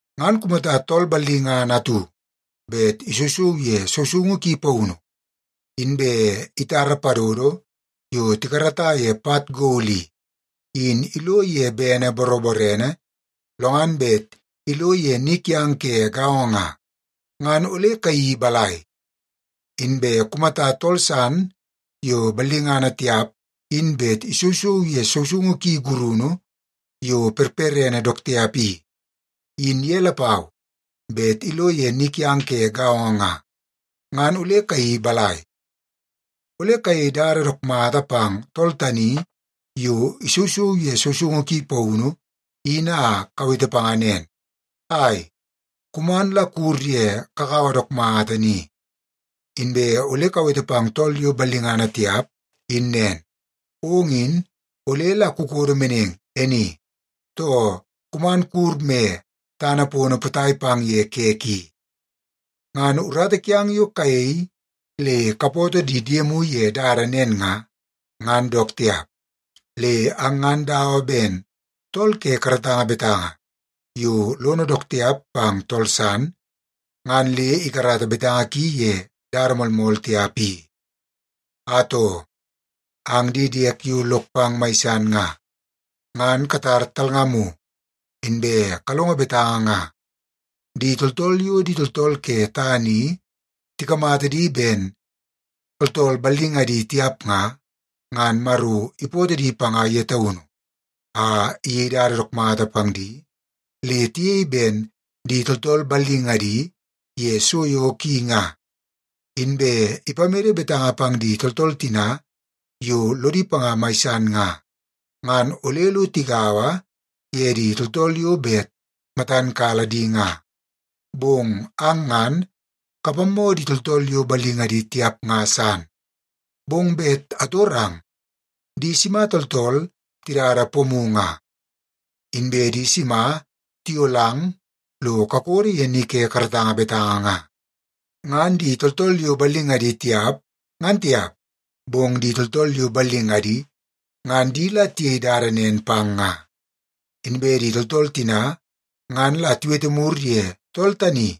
Ngan kumata tool ballingana atu bet isousou ye sousoungu ki paunu, inbe itara padodo yo tikarata ye pat gol i, in ilo ye bene boroborene, lo ngan bet ilo ye ni kiang ke gaongo nga, ngan ole kayeii balai? Inbe kumata tool san yo ballingana tiap in bet isousou ye sousoungu ki gurunu yo perperene dook tiap i, in ye lapau bet ilo ye ni kiang ke gaongo nga, ngan ole kayeii balai? Ole kayei dada dook mata pang tool tani yo isousou ye sousoungu ki paunu in a kawete panga nen, “Ai, kuman la kuwur ye kakawa dook mata ni.” Inbe ole kawete pang tool yo ballingana tiap in nen, “Ong in ole la kukodo meneng e ni,” too “Kuman kuwur me tana pono potai pang ye kek i.” Ngan urata kiang yo kayei le kapoto di diemu ye dada nen nga, ngan dook tiap. Le ang ngan dawa ben tool ke karatanga betanga yo lono dook tiap pang tool san ngan le ikarata betanga ki ye dada moolmool tiap i. Atoo, ang di diek yo lok pang mai san nga, ngan katar talngamu, inbe kalongo betanga nga. Di tooltool yo di tooltool ke tana i tikamata di ben tooltool ballingadi tiap nga, ngan Maro ipootoo di panga ye taunu a iyei dada dook mata pang di le tiyei ben di tooltool ballingadi ye so yo ki nga. Inbe ipamede betanga pang di tooltool tina yo lodi panga mai san nga, ngan ole lo tigaua ye di tooltool yo bet matan kala di nga. Bong ang ngan kapammoo di tooltool yo ballingadi tiap nga san. Bong bet atorang, di sima tooltool tidada pomu nga? Inbe di sima tiyolang lo kakodo ye ni ke karatanga betanga nga? Ngan di tooltool yo ballingadi tiap, ngan tiap, bong di tooltool yo ballingadi ngan di la tiyei dada nen pang nga. Inbe di tooltool tina ngan la tiwete mur ye tool tani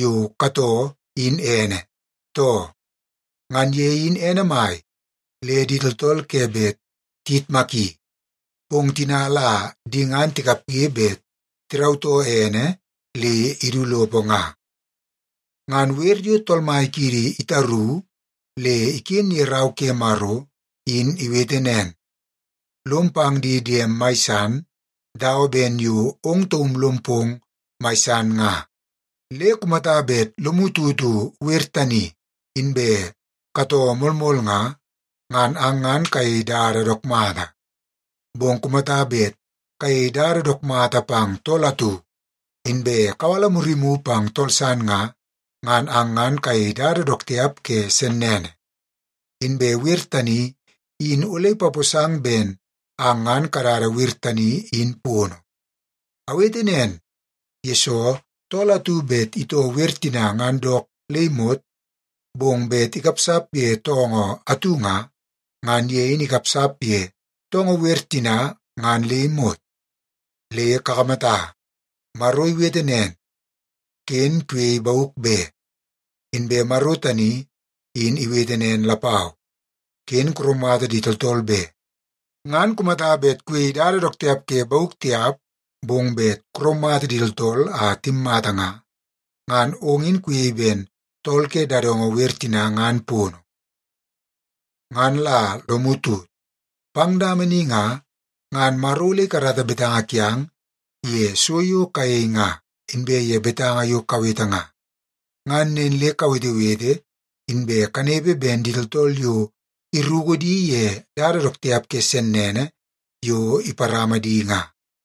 yo katoo in ene, too? Ngan ye in ene mai le di tooltool ke bet tiyitmaki, bong tina la di ngan tikapge bet tirautoo ene le idu lopo nga. Ngan wer yo Tool Mai kiidi itaru le iken ye Rau ke Maro in iwete nen, “Lom pang di diem mai san dawa ben yo ong taum lom pong mai san nga.” Le kumata bet lomu tutu wer tani, inbe katoo moolmool nga, ngan ang ngan kayei dada dook mata. Bong kumata bet kayei dada dook mata pang tool atu, inbe kawala murimu pang tool san nga, ngan ang ngan kayei dada dook tiap ke sennene. Inbe wer tani in ole ipaposang ben ang ngan kadada wer tani in pono. Awete nen, yesoo tool atu bet itoo wer tina ngan dook le imot, bong bet ikapsap ye toongoo atu nga, ngan ye in ikapsap ye toongoo wer tina ngan le imot. Le kakamata, Maro iwete nen, “Ken kuyei bauk be.” Inbe Maro tani in iwete nen lapau, “Ken kuraumata di tooltool be.” Ngan kumata bet kuyei dada dook tiap ke bauk tiap, bong bet kuraumata di tooltool a timmata nga, ngan ong in kuyei ben tool ke dadongo wer tina ngan pono. Ngan la lomu tut, pang dama ni nga, ngan Maro ole ikarata betanga kiang ye so yo kayei nga, inbe ye betanga yo kawete nga. Ngan nen le kawetewete inbe kanepe ben di tooltool yo iruku di ye dada dook tiap ke sennene yo iparama di nga.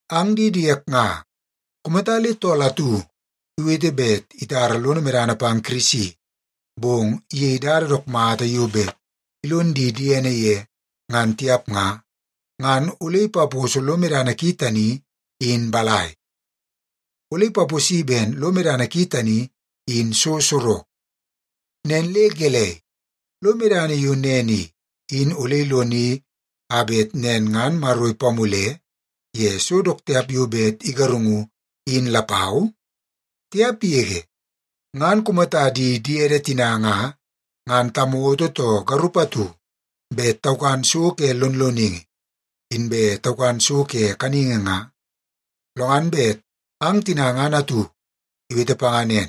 Ang di diek nga, kumata le tool atu iwete bet itara lono medana pang Kirisi, bong iyei dada dook mata yo bet ilon di diene ye ngan tiap nga, ngan ole ipaposo lo medana ki tani in balai? Ole ipaposi ben lo medana ki tani in so sorok. Nen le gelei, lo medana yo nen i, in ole iloni a bet nen ngan Maro ipamule ye so dook tiap yo bet igarungu in lapau? Tiap yege! Ngan kumata di diede tina nga, ngan tamoto too garup atu bet taukan so ke lonloningi, inbe taukan so ke kaningi nga, lo ngan bet ang tina ngan atu iwete panga nen,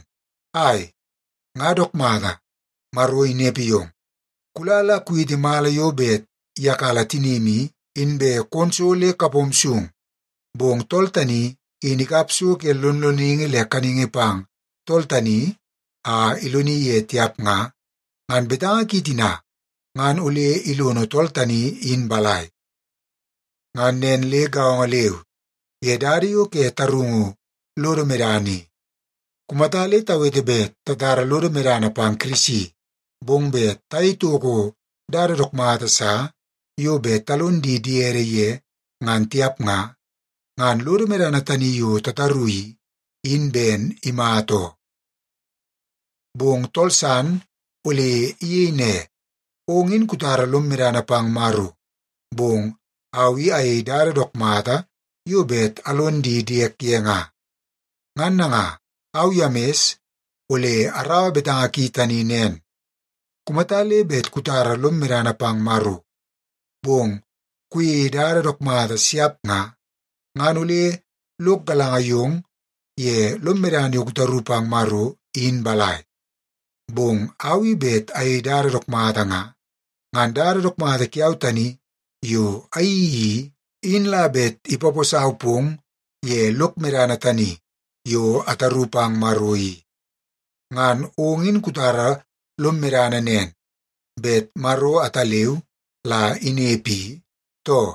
“Ai, nga dook mata, Maro inepe yong. Kula la kuwiti mala yo bet iyakala tinim i, inbe kon so le kapom sung,” bong tool tani in ikap so ke lonloningi le kaningi pang tool tani a iloni ye tiap nga, ngan betanga ki tina ngan ole ilono tool tani in balai? Ngan nen le gaongo leu ye dada yo ke tarungu lodo medana i. Kumata le tawete bet tatara lodo medana pang Kirisi, bong bet tayei toko dada dook mata sa yo bet talon di diede ye ngan tiap nga, ngan lodo medana tani yo tataru i, in ben imata oo. Bong tool san ole iyei ne, “Ong in kutara lom medana pang Maro, bong au i ayei dada dook mata yo bet alon di diek ye nga.” Ngan nanga, au Yemis ole araua betanga ki tani nen. Kumata le bet kutara lom medana pang Maro, bong kuyeie dada dook mata siap nga, ngan ole lok galanga yong ye lom medana yo kutaru pang Maro in balai? Bong au i bet ayei dada dook mata nga, ngan dada dook mata kiau tani yo ayeii i, in la bet ipaposau pong ye lok medana tani yo ataru pang Maro i. Ngan ong in kutara lom medana nen, bet Maro ataleu la inepe i, too?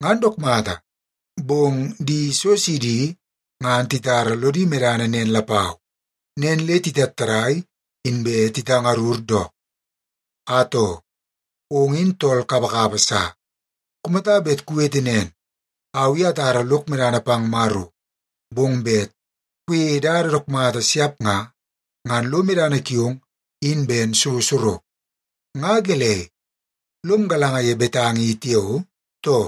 Ngan dook mata! Bong di so sidi ngan titara lodi medana nen lapau, nen le titattadai inbe titangarur dook. Atoo, ong in tool kapakapa sa! Kumata bet kuwete nen, “Au i atara lok medana pang Maro,” bong bet kuyeie dada dook mata siap nga, ngan lo medana kiong in ben so sorok. Nga gelei, lom galanga ye betanga i tiao, too?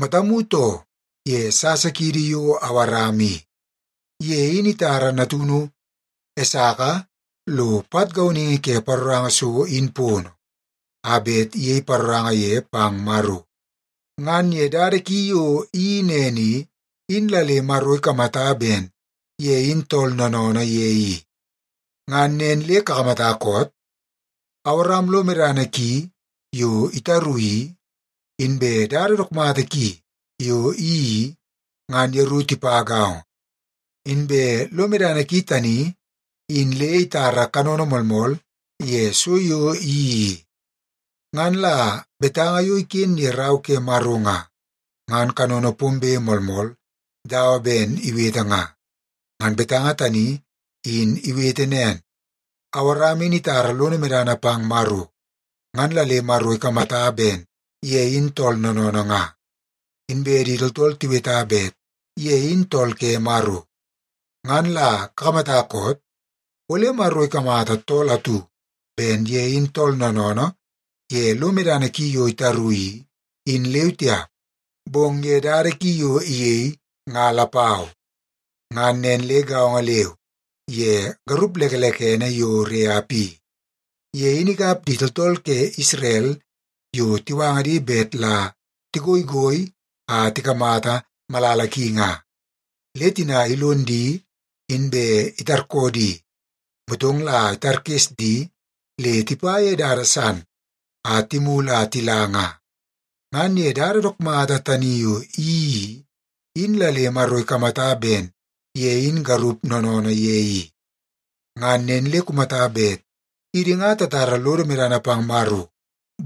Matamu too ye sasa kiidi yo Awaram i. Ye in itara natunu Esaka lo pat gauningi ke paroranga so in pono a bet iyei paroranga ye pang Maro. Ngan ye dada ki yo iyeii nen i, in la le Maro ikamata ben ye in tool noonoonoo ye i. Ngan nen le kakamata koot? Awaram lo medana ki yo itaru i, inbe dada dook mata ki yo iyeii i, ngan yeru tipa gaongo. Inbe lo medana ki tani in le itara kanono moolmool ye so yo iyeii i. Ngan la betanga yo iken ye Rau ke Maro nga, ngan kanono pombe moolmool dawa ben iwete nga. Ngan betanga tani in iwete nen, “Awaram in itara lono medana pang Maro, ngan la le Maro ikamata ben ye in tool noonoonoo nga.” Inbe di tooltool tiweta bet ye in tool ke Maro. Ngan la kakamata koot? Ole Maro ikamata tool atu ben ye in tool noonoonoo ye lo medana ki yo itaru, in leu tiap, bong ye dada ki yo iyei nga lapau. Ngan nen le gaongo leu ye garup lekelekene yo Reap i. Ye in ikap di tooltool ke Isrel yo tiwanga di bet la tigoigoi a tikamata malala ki nga. Le tina ilon di inbe itarkoo di, motong la itarkes di le tipa ye dada san, a timulu a tila nga. Ngan ye dada dook mata tani yo iyeii i, in la le Maro ikamata ben ye in garup noonoonoo ye i. Ngan nen le kumata bet idi nga tatara lodo medana pang Maro,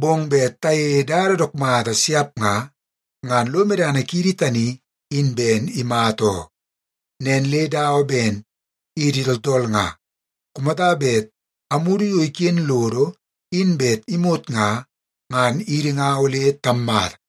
bong bet tayeie dada dook mata siap nga, ngan lo medana kiidi tani in ben imata oo. Nen le dawa ben idi tooltool nga, kumata bet amudu yo iken lodo in bet imot nga, ngan idi nga ole tammata.